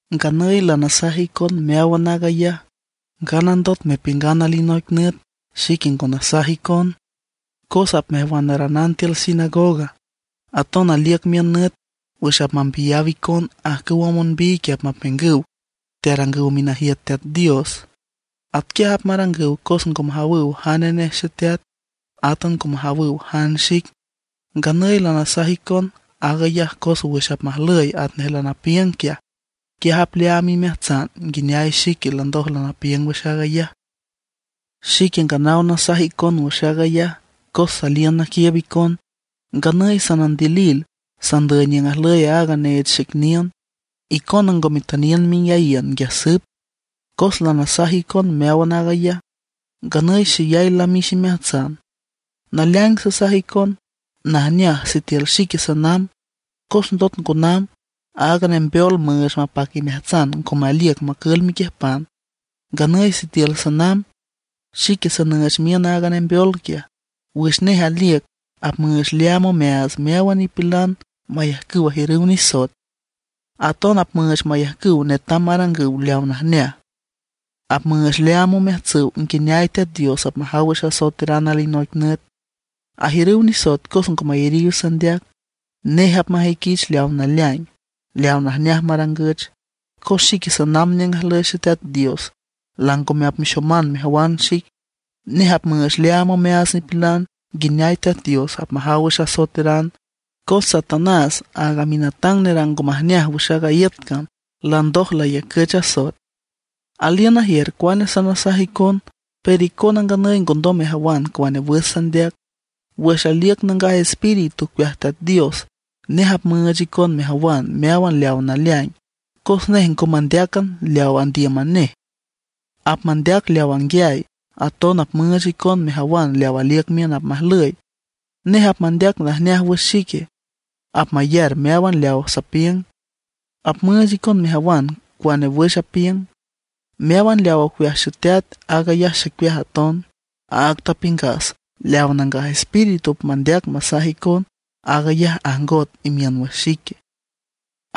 ’Nganüy lanasaj icon meáwan aag ayaj, nganandot mepiüngan alinoic nüt xique ngo nasaj icon. Cos apmejwanaranan tiül sinagoga. Aton aliüc miün nüt wüx apmambiyaw icon. Ajcüwa monbiy quiaj apmapiüngüw tearangüw minajiüt Teat Dios. Atquiaj apmarangüw cos ngo majawüw jane nej Xeteat, átan ngo majawüw jan xic. Nganüy lanasaj icon aag ayaj cos wüx apmajlüy atnej lanapiüng quiaj, quiaj apleaam imeajtsan nguineay xique landoj lanapiüng wüx aag ayaj. ’Xique nganaw nasaj icon wüx aag ayaj cos saliün naquiiüb icon. Nganüy sanandilil, sandüy niüng ajlüy aaga neech xic niün; icona ngo metüniün menguiayiün nguiaj süp. Cos lanasaj icon meáwan aag ayaj, nganüy xeyay lamix imeajtsan. Naleaing sasaj icon, najneaj sitiül xique sanamb; cos ndot ngo namb, aaga Nembeol müüch mapac imeajtsan ngome aliüc macül mequiüjpan. Nganüy sitiül sanamb, xique sanüüch miün aaga Nembeol quiaj. Wüx nej aliüc, apmüüch leaam omeaats meáwan nipilan mayajcüw ajiürüw nisoet; aton apmüüch mayajcüw netam marangüw leawa najneaj. Apmüüch leaam omeajtsüw nguineay Teat Dios apmajaw wüx asoeteran alinoic nüt. Ajiürüw nisoet cos ngo mayariw sandeac. Nej apmajüiquich leaw naleaing, leaw najneaj marangüch, cos xique sanamb niüng ajlüy Xeteat Dios, langome apmexoman mejawan xic. Nej apmüüch leaam omeaats nipilan nguineay Teat Dios apmajaw wüx asoeteran; cos Satanás, aaga minatang nerang ngo majneaj wüx aaga iüt cam landoj layacüch asoet. ’Aliün najiür cuane sanasaj icon; pero icona nganüy ngondom mejawan cuane wüx sandeac. Wüx aliüc Nangaj Espíritu ocueaj Teat Dios, nej apmüüch icon mejawan meáwan leaw naleaing; cos nej ngo mandeácan leawa andíüman nej, apmandeac leaw anguiay, aton apmüüch icon mejawan leaw aliüc miün apmajlüy. Nej apmandeac najneaj wüx xique. Apmayar meáwan leawa sapiüng, apmüüch icon mejawan cuane wüx apiüng. Meáwan leaw ocueaj Xeteat, aag ayaj xicueaj aton. Áag tapiüngas leaw Nangaj Espíritu apmandeac masaj icon, aag ayaj ajngot imiün wüx xique.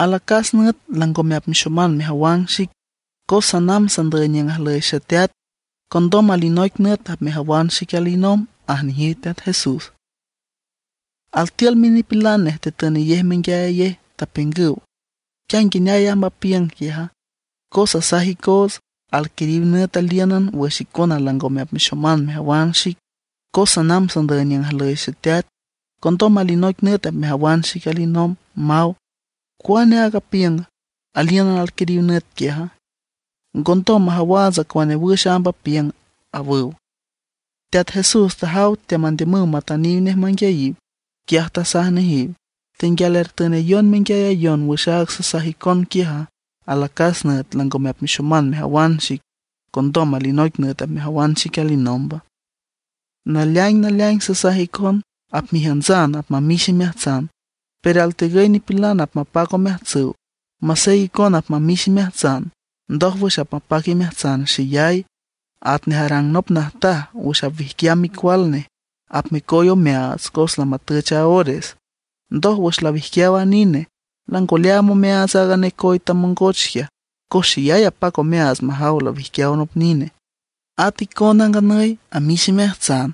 ’Alacas nüt langome apmexoman mejawan xic, cos sanamb sandüy niüng ajlüy Xeteat. Condom alinoic nüt apmejawan xic alinomb ―aj nejiw Teat Jesús. Altiül minipilan nej tatünayej menguiayayej, tapiüngüw: ―¿Quia nguineay amb aag apiüng quiaja? Cos asaj icoots: “Alquiriw nüt alíünan wüx icona langome apmexoman mejawan xic, cos sanamb sandüy niüng ajlüy Xeteat. Condom alinoic nüt apmejawan xic alinomb”, maw. ¿Cuane aag apiüng: “Alíünan alquiriw nüt quiaja”? Ngondom majawaats cuane wüx amb apiüng ―awüw. Teat Jesús tajaw teamandiümüw matüniw nej manguiayiw. Quiaj tasaj nejiw: ―¿Tenguial ertünayon menguiayayon wüx áag sasaj icon quiaja, alacas nüt langome apmexoman mejawan xic, condom alinoic nüt apmejawan xic alinomba? Naleaing naleaing sasaj icon, apmejiüntsan apmamix imeajtsan, pero altegüy nipilan apmapac omeajtsüw. Masey icona apmamix imeajtsan, ndójwüx apmapac imeajtsan xeyay. Atnej arang nop najtaj wüx apwijquiam micual nej, apmecoy omeaats cos lamatüch a ores. Ndoj, wüx lawijquiaw a nine, lango leaam omeaats aaga necoy tamongoch quiaj, cos xeyay apac omeaats majaw lawijquiaw nop nine. At icona, nganüy amix imeajtsan;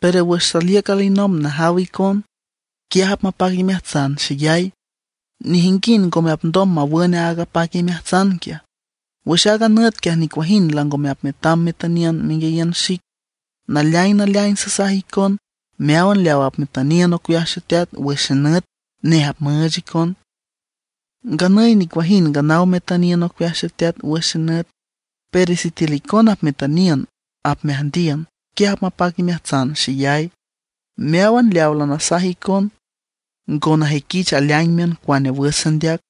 pero wüx saliüc alinomb najaw icon, quiaj apmapac imeajtsan xeyay; nejinguind ngome apndom mawün aaga apac imeajtsan quiaj. ’Wüx aaga nüt quiaj nicuajind langome apmetam metüniün menguiayiün xic. Naleaing naleaing sasaj icon meáwan leaw apmetüniün ocueaj Xeteat wüx xenüt, nej apmüüch icon. Nganüy nicuajind nganaw metüniün ocueaj Xeteat wüx xenüt; pero sitiül icona apmetüniün apmeajndiün, quiaj apmapac imeajtsan xeyay. ’Meáwan leawa lanasaj icon ngo najüiquich aleaing miün cuane wüx sandeac.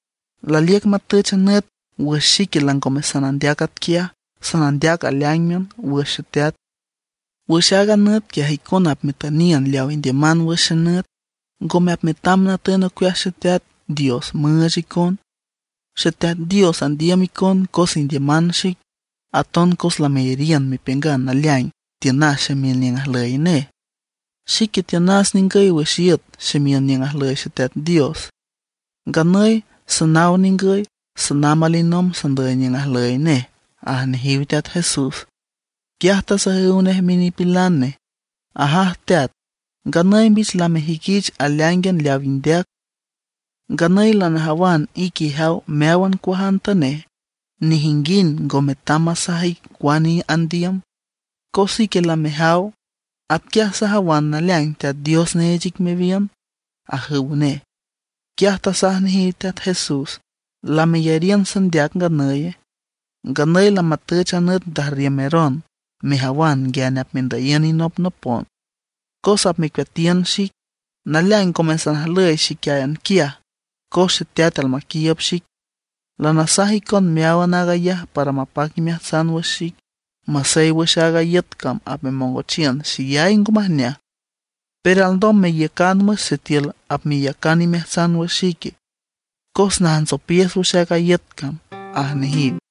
Laliüc matüch a nüt wüx xique langome sanandeac atquiaj, sanandeac aleáingan wüx Xeteat. Wüx aaga nüt quiaj icona apmetüniün leaw indiüman wüx xenüt, ngome apmetam natün ocueaj Xeteat Dios müüch icon. Xeteat Dios andiüm icon cos indiüman xic. Aton cos lameyariün mepiüngan naleaing tiünas ximiün niüng ajlüy nej. Xique tiünas ningüy wüx iüt ximiün niüng ajlüy Xeteat Dios. Nganüy sanaw ningüy, sanamb alinomb sandüy niüng ajlüy nej ―aj nejiw Teat Jesús. Quiaj tasajüw nej minipilan nej: ―¡Ajaj teat, nganüy mbich lamejüiquich aleáingan leaw indeac! Nganüy lanajawan ique ijaw meáwan cuajantanej. Nejinguind ngo metam masaj ic cuane andiüm, cos ique lamejaw. Atquiaj sajawan naleaing Teat Dios neech ic mewiün ―ajüw nej. Quiaj tasaj nejiw Teat Jesús: ―¿Lameyariün sandeac nganüye? Nganüy lamatüch a nüt ndajrriümeron, mejawan nguiane apmendüyiün inopnopon, cos apmecueatiün xic. Naleaing ngome sanajlüy xíquian quiaj cos Xeteat almaquiiüb xic. Lanasaj icon meáwan aag ayaj para mapac imeajtsan wüx xic. Masey wüx aaga iüt cam apmemongochiün xeyay ngo majneaj, pero alndom meiücan wüx sitiül apmeyacan imeajtsan wüx xique, cos najntsopiüs wüx aaga iüt cam ―aj nejiw.